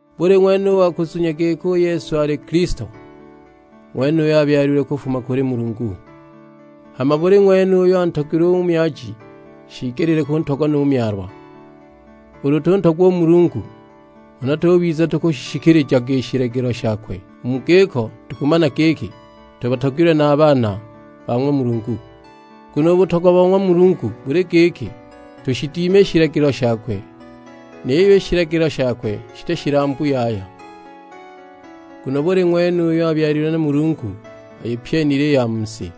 Buli ng'wene u wa kuzunya giki u Yesu ali Kilisto, u ng'wenuyo abyalilwe kufuma kuli Mulungu; hama buli ng'wene uyo antogilwe u myaji shiigeli kuntogwa nu myalwa. Ulu tuntogwa u Mulungu, huna tubiza tukushishikilijaga i shilagilo shakwe, u mu giko tukumana giki tubatogilwe na a baana ba ng'wa Mulungu. Nguno u butogwa bo ng'wa Mulungu buli giki, tushidime i shilagilo shakwe; niyo i shilagilo shakwe shiti shilambu yaya. Nguno buli ng'wene uyo abyalilwe na Mulungu ayipyenile i ya mu si,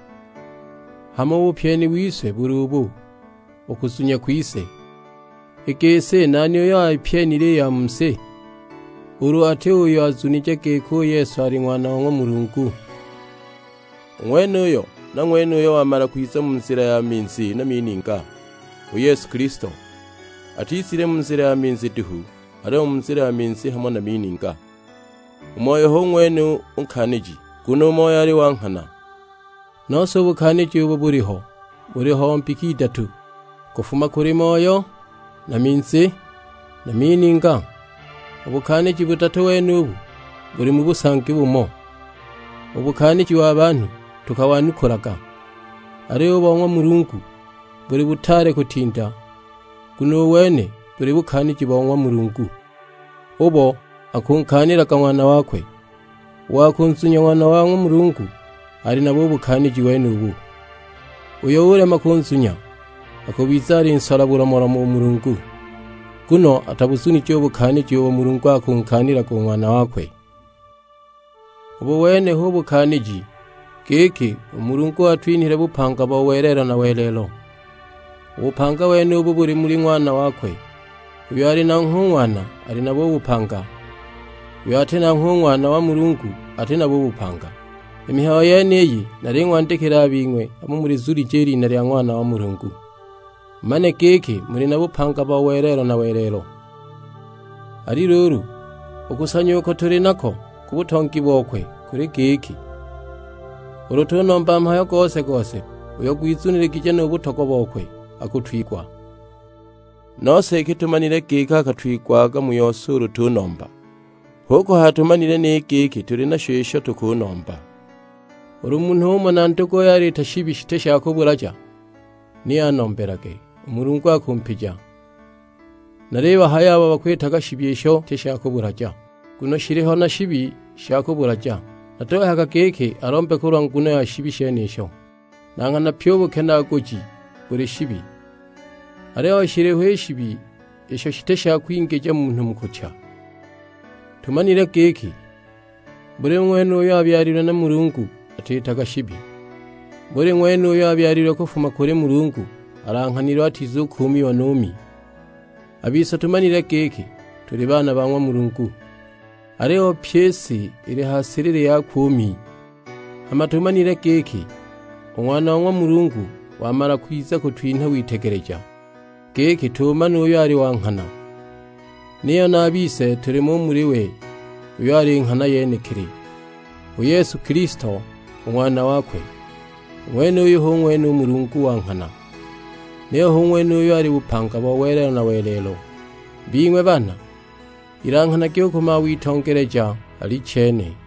hama u bupyeni wise buli ubu, u kuzunya kwise. I gisi nani uyo ayipyenile i ya mu si, ulu ati uyo azunije giki u Yesu ali Ng'wana wa ng'wa Mulungu? U ng'wenuyo na ng'wene uyo wamala kwiza mu nzila ya minzi na mininga; u Yesu Kilisto. Atizile mu nzila ya minzi duhu, aliyo mu nzila ya minzi hamo na mininga. U Moyo hu ng'wene u Nkaaniji, nguno u Moyo ali wa nghana. Nose u bukaaniji ubo buliho buli bo mbika idatu. Kufuma kuli Moyo, na minzi, na mininga; u bukaaniji budatu wenubu buli mu busangi bumo. U bukaaniji wa banhu tukawanukulaga, aliyo u bo ng'wa Mulungu buli butaale kutinda. Nguno u wene buli bukaaniji bo ng'wa Mulungu, ubo akunkaanilaga Ng'wana wakwe. U wa kunzunya Ng'wana wa ng'wa Mulungu, ali nabo u bukaaniji wenubu; uyo ulema kunzunya, akubiza alinsola bulomolomo u Mulungu. Nguno atabuzunije u bukaaniji ubo Mulungu akunkaanilaga u Ng'wana wakwe. Ubu wene hu bukaaniji, giki u Mulungu watwinhile bupanga bo welelo na welelo; u bupanga wenubo buli muli Ng'wana wakwe. Uyo ali nanghwe u Ng'wana ali nabo u bupanga; uyo ati nanghwe u Ng'wana wa ng'wa Mulungu ati nabo u bupanga! I mihayo yeniyi naling'wandikila a bing'we abo mulizunije i lina lya Ng'wana wa ng'wa Mulungu, mumane giki muli na bupanga bo welelo na welelo. Ali luulu, u kusanya uko tuli nako ku butongi bokwe kuli giki, ulu tunomba mhayo gose-gose uyo gwizuniligije nu butogwa bokwe, akutwigwa. Nose iki tumanile giki akatwigwaga mu yose ulu tunomba, hu kuhaya tumanile ni giki tuli nasho isho tukunomba. Ulu munhu umona nduguye aliita shibi shiti sha kubulaja, ni anombelage, u Mulungu akumpija. Nalibahaya abo bakwita shibi isho shiti sha kubulaja; nguno shiliho na shibi sha kubulaja, natuhayaga giki alombe kulwa nguno ya shibi shenisho! Na nghana pyi u bukenaaguji buli shibi, aliyo shiliho i shibi isho shiti sha kwingija munhu mu kucha. Tumanile giki buli ng'wene uyo abyalilwe na Mulungu atiitaga shibi, buli ng'wene uyo abyalilwe kufuma kuli Mulungu alanghanilwe atizukuumiwa nu Mi. A bise tumanile giki tuli baana ba ng'wa Mulungu, aliyo pyi i si ili ha silili yakwe u Mi. Hama tumanile giki u Ng'wana wa ng'wa Mulungu wamala kwiza kutwinha witegeleja, giki tuumane uyo ali wa nghana; niyo na a bise tulimo u muli we uyo ali nghana yenekili, u Yesu Kilisto u Ng'wana wakwe. U ng'wenuyu hu ng'wene u Mulungu wa nghana, niyo hu ng'wene uyo ali bupanga bo welelo na welelo. Bing'we baana, ilanghanagi u ku mawitongeleja: Alichene.